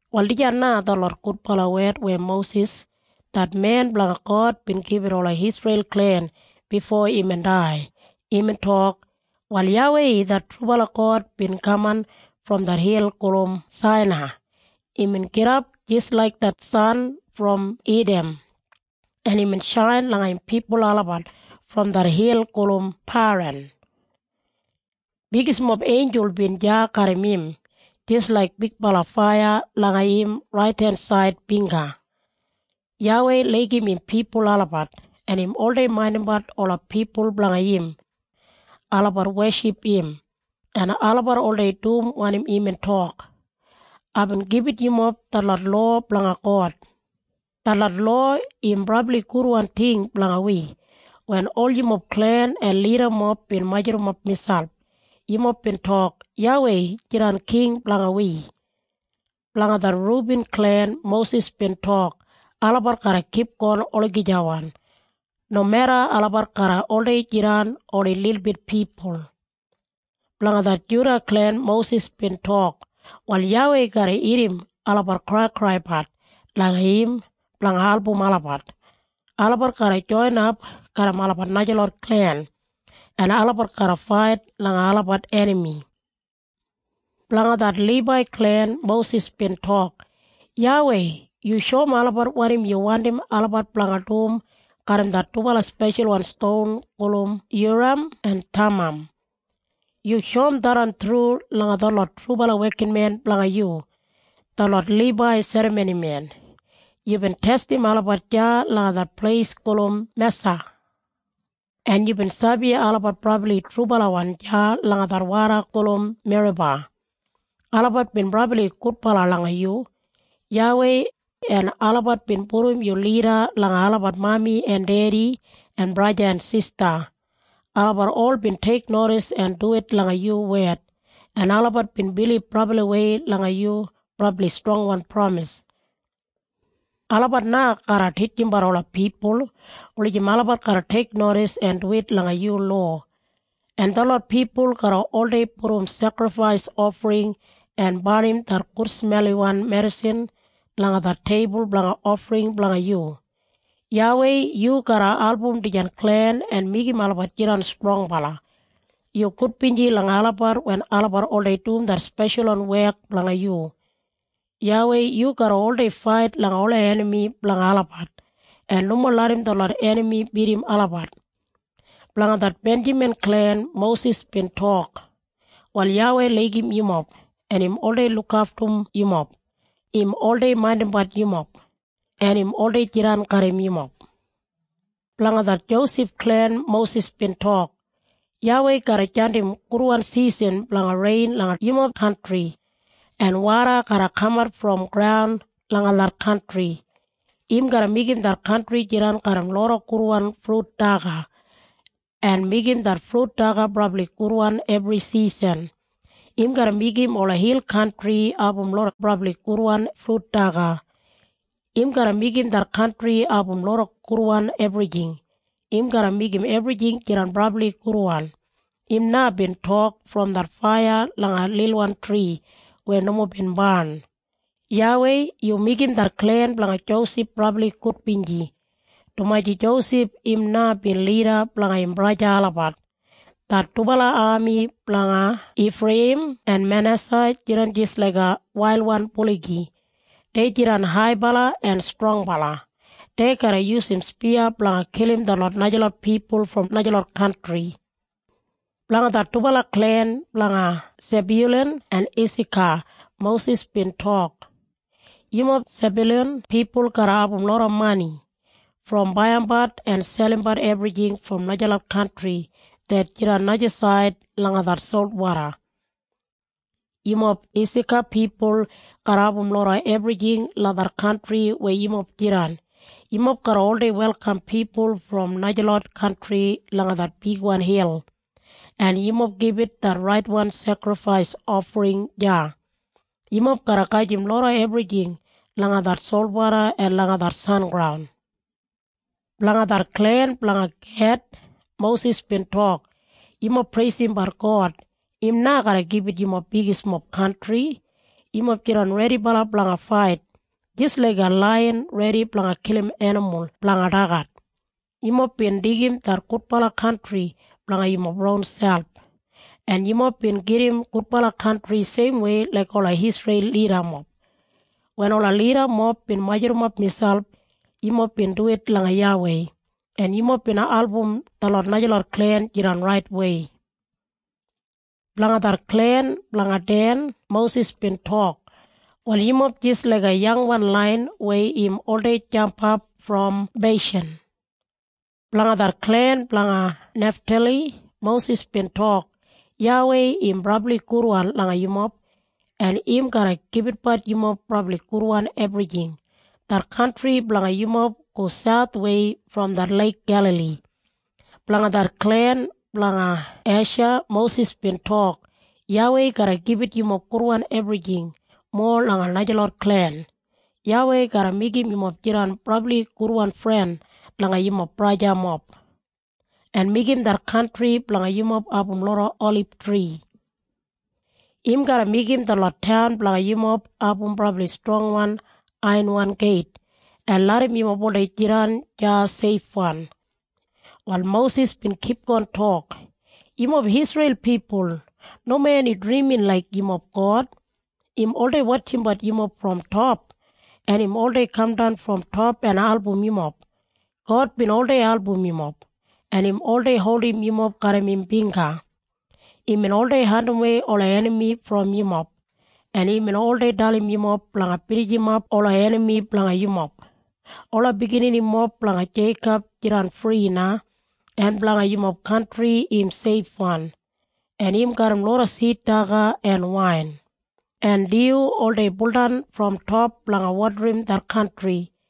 Wal dijan na detlot gudbala wed weya Mosis, det men blanga God bin gibit ola Isreil klen bifo imbin dai. Imbin tok, “Wal YAWEI det trubala God bin kaman brom det hil gulum Sainai. Imbin gidap jis laik det san brom Idam, en imbin shain langa im pipul olabat brom det hil gulum Paran. Bigismob einjul bin deya garram im, jis laik bigbala faiya langa im raidensaid bingga. YAWEI laigim im pipul olabat, en im oldei maindimbat ola pipul blanga im. Olabat weship im, en olabat oldei dum wanim imbin tok. Aibin gibit yumob detlot lowa blanga God. Detlot lowa im brabli gudwan ting blanga wi. Wen ol yumob klen en lidamob bin majurrumap miselp, yumob bin tok, ‘YAWEI jidan king blanga wi.’” Blanga det Rubin klen Mosis bin tok, “Olabat garra kipgon olagijawan, nomeda olabat garra oldei jidan oni lilbit pipul.” Blanga det Juda klen Mosis bin tok, “Wal YAWEI garra irrim olabat kraikraibat langa im blanga album olabat. Olabat garra joinap garram olabat najalot klen, en olabat garra fait langa olabat enami.” Blanga det Libai klen Mosis bin tok, “YAWEI, yu shoum olabat wanim yu wandim olabat blanga dum garram det dubala speshalwan ston gulum Yuram en Thamam. Yu shoum tharran thru langa detlot trubala wekinmen blanga yu, detlot Libai serramonimen. Yubin testim olabat deya langa det pleis gulum Mesa, en yubin sabi olabat brabli trubalawan deya langa det woda gulum Meriba. Olabat bin brabli gudbala langa yu, YAWEI, en olabat bin pudum yu lida langa olabat mami en dedi en braja en sista. Olabat ol bin teiknodis en duwit langa yu wed, en olabat bin bilib brabliwei langa yu brabli strongwan pramis. Olabat na garra titjimbat ola pipul, wulijim olabat garra teiknodis en duwit langa yu lowa. En detlot pipul garra oldei pudum sekrifais ofring en barnim det gudsmelwan medisin langa det teibul blanga ofring blanga yu. YAWEI, yu garra album dijan klen en meigim olabat jidan strongbala. Yu gudbinji langa olabat wen olabat oldei dum det speshalwan wek blanga yu. YAWEI yu garra oldei fait langa ola enami blanga olabat, en nomo larram detlot enami bidim olabat.” Blanga det Benjamin klen Mosis bin tok, “Wal YAWEI laigim yumob, en im oldei lukaftum yumob. Im oldei maindimbat yumob, en im oldei jidan garram yumob.” Blanga det Josef klen Mosis bin tok, “YAWEI garra jandim gudwan sisan blanga rein langa yumob kantri, en springwoda garra kamat brom graun langa det kantri. Im garra meigim det kantri jidan garram loda gudwan frut daga, en meigim det frut daga brabli gudwan ebri sisan. Im garra meigim ola hil kantri abum loda brabli gudwan frut daga. Im garra meigim det kantri abum loda gudwan ebrijing. Im garra meigim ebrijing jidan brabli gudwan. Im na bin tok brom det faiya langa lilwan tri weya nomo bin barn. YAWEI, yu meigim det klen blanga Josef brabli gudbinji, dumaji Josef im na bin lida blanga im braja olabat. Det dubala ami blanga Ifreiyim en Manesa jidan jis laiga wailwan buligi. Dei jidan haibala en strongbala. Dei garra yusum spiya blanga kilim detlot najalot pipul brom najalot kantri.” Blanga det dubala klen blanga Sebyulan en Isaka Mosis bin tok, “Yumob Sebyulan pipul garra abum loda mani brom baiyimbat en selimbat ebrijing brom najalot kantri det jidan najasaid langa det solwoda. Yumob Isaka pipul garra abum loda ebrijing langa det kantri weya yumob jidan. Yumob garra oldei welkam pipul brom najalot kantri langa det bigwan hil, en yumob gibit det raitwan sekrifais ofring deya. Yumob garra gajim loda ebrijing langa det solwoda en langa det sengraun.” Blanga det klen blanga Ged Mosis bin tok, “Yumob preisimbat God. Im na garra gibit yumob bigismob kantri. Yumob jidan redibala blanga fait, jis laiga laiyan redi blanga kilim enimul blanga dagat. Yumob bin deigim det gudbala kantri blanga yumob ronselp, en yumob bin gedim gudbala kantri seimwei laik ola Isreil lidamob. Wen ola lidamob bin majurrumap miselp, yumob bin duwit langa YAWEI, en yumob bin album detlot najalot klen jidan raitwei.” Blanga det klen blanga Den Mosis bin tok, “Wal yumob jis laiga yangwan laiyan weya im oldei jampap brom Beishan.” Blanga det klen blanga Neftali Mosis bin tok, “YAWEI im brabli gudwan langa yumob, en im garra gibitbat yumob brabli gudwan ebrijing. Det kantri blanga yumob go sauthwei brom det Leik Gelali.” Blanga det klen blanga Esha Mosis bin tok, “YAWEI garra gibit yumob gudwan ebrijing, mowa langa najalot klen. YAWEI garra meigim yumob jidan brabli gudwan fren langa yumob brajamob, en meigim det kantri blanga yumob abum loda olibtri. Im garra meigim detlot taun blanga yumob abum brabli strongwan aiyanwan geit, en larram yumob oldei jidan deya seifwan.” Wal Mosis bin kipgon tok, “Yumob Isreil pipul, nomo eni drimin laik yumob God. Im oldei wotjimbat yumob brom top, en im oldei kamdan brom top en album yumob. God bin oldei album yumob, en im oldei holdim yumob garram im bingga. Imbin oldei andimwei ola enami brom yumob, en imbin oldei dalim yumob blanga binijimap ola enami blanga yumob. Ola bigininimob blanga Jeikob jidan fri na, en blanga yumob kantri im seifwan, en im garram loda sid daga en wain. En dyu oldei buldan brom top blanga wodarim det kantri.